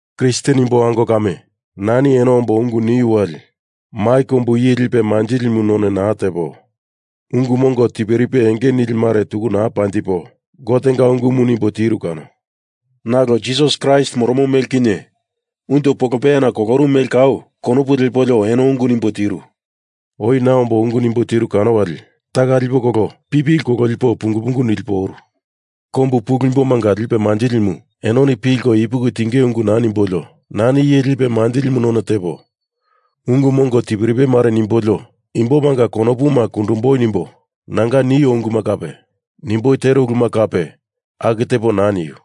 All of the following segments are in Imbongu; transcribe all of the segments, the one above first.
Kristen imbo ango kame, nani eno ombo ungu niu wali mai kombu iye lipe manjilimu none naa tepo ungu mongo tiperipe enge nilimare tuku naa panjipo Gotenga ungumu nimbo tiru kano. Nalo Jisas Kraist moromo mele kinye unjo polopeyana kolorumu mele kau konopu lepolio eno ungu nimbo tiru. Oi na ombo ungu nimbo tiru kano wali taka lipo kolo pipili kololipo pungu pungu nilipo oru. Kombu pulu imbomanga lipe manjilimu enoni pilko ipuki tingei ungu naa nimbolio nani iye lipe manjilimu none tepo ungu mongo tiperipe mare nimbolio imbomanga konopuma kundumboi nimbo nanga nio unguma kape nimboi tero uluma kape aku tepo naa niu.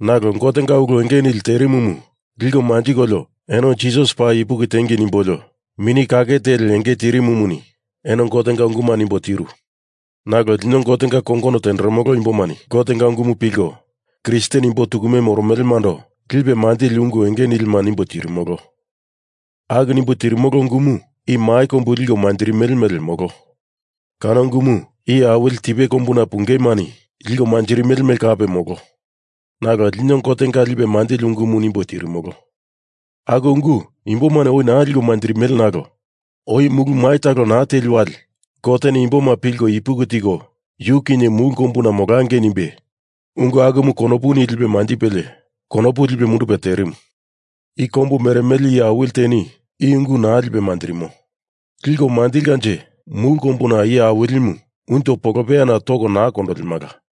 Nalo Gotenga ulu enge nili terimumu liko manjikolio eno Jisas paa ipuki tiengei nimbolio Mini Kake Teli enge tirimumuni eno Gotenga unguma nimbo tiru. Nalo lino Gotenga kongono tenderemolo imbomani Gotenga ungumu pilko Kristen imbo tukume moromelemando lipe manjili ungu enge nilima nimbo tirimolo. Aku nimbo tirimolo ungumu i mai kombu liko manjirimele mele, molo. Kano ungumu iye awili tipe kombuna pungeimani liko manjirimele mele kape, molo. Nalo lino Gotenga lipe manjili ungumu nimbo tirimolo. Aku ungu imbomani oi naa liko manjirimele nalo oi mulu mai talo naa teli wali Goteni imboma pilko ipuki tiko yu kinye mulu kombuna molangei nimbe ungu akumu konopu lipe manjipelie konopu lipe mundupe terimu. I kombu meremele iye awili teni i ungu naa lipe manjirimo. Liko manjilimalanje mulu kombumunga Iye Awilimu unjo polopeyana toko naa kondolemala.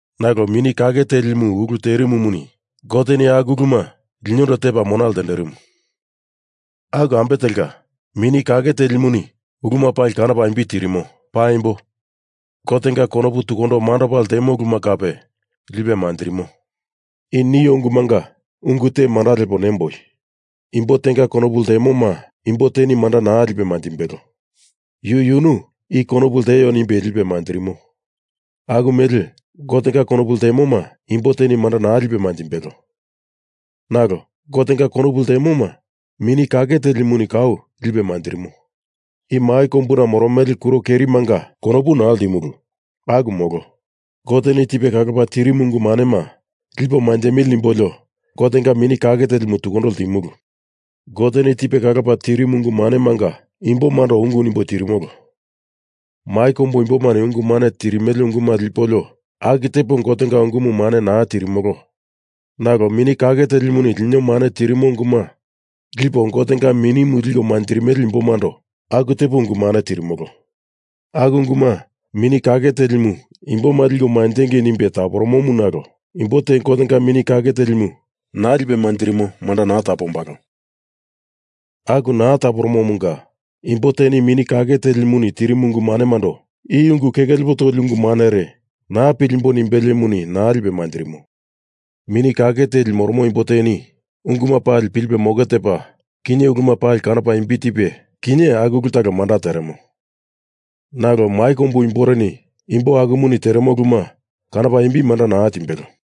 Nalo Mini Kake Telimu ulu teremomuni Goteni aku uluma linondo tepa mona ltenderimu. Aku ambe telka, Mini Kake Telimuni uluma pali kanopa imbi tirimo. Paimbo, Gotenga konopu tukundo mandopa ltemo uluma kape lipe manjirimo. I nio ungumunga ungu te manda lepo nimboi. Imbo tenga konopu ltemoma imbo teni manda naa lipe manjimbelo. Yu yunu i konopu lteo nimbe lipe manjirimo. Aku mele Gotenga konopu ltemoma imbo teni manda naa lipe manjimbelo, nalo Gotenga konopu ltemoma Mini Kake Telimuni kau lipe manjirimo. I mai kombuna moromele kuro kerimanga konopu naa ltimulu. Aku molo. Goteni tipe kalopa tirimu ungu manema lipo manjemili nimbolio Gotenga Mini Kake Telimu tukundo ltimulu. Goteni tipe kalopa tirimu ungu manemanga imbomando ungu nimbo tirimolo. Mai kombu imbomani ungu mane tirimele unguma lipolio aku tepo Gotenga ungumu mane naa tirimolo nalo Mini Kake Telimuni lino mane tirimo unguma lipo Gotenga Minimu liko manjirimele imbomando aku tepo ungu mane tirimolo. Aku unguma Mini Kake Telimu imboma liko manjengei nimbe taporomomu nalo imbo te Gotenga Mini Kake Telimu naa lipe manjirimo manda naa tapombalo. Aku naa taporomomunga imbo teni Mini Kake Telimuni tirimu ungu manemando i ungu keke lepo toli ungu mare naa pilimboi nimbeliemuni naa lipe manjirimo. Mini Kake Telimu moromo imbo teni unguma pali pilipe moke tepa kinye uluma pali kanopa imbi tipe kinye aku ulu talo manda teremo. Nalo mai kombu imboreni imbo akumuni teremo uluma kanopa imbi manda naa timbelo.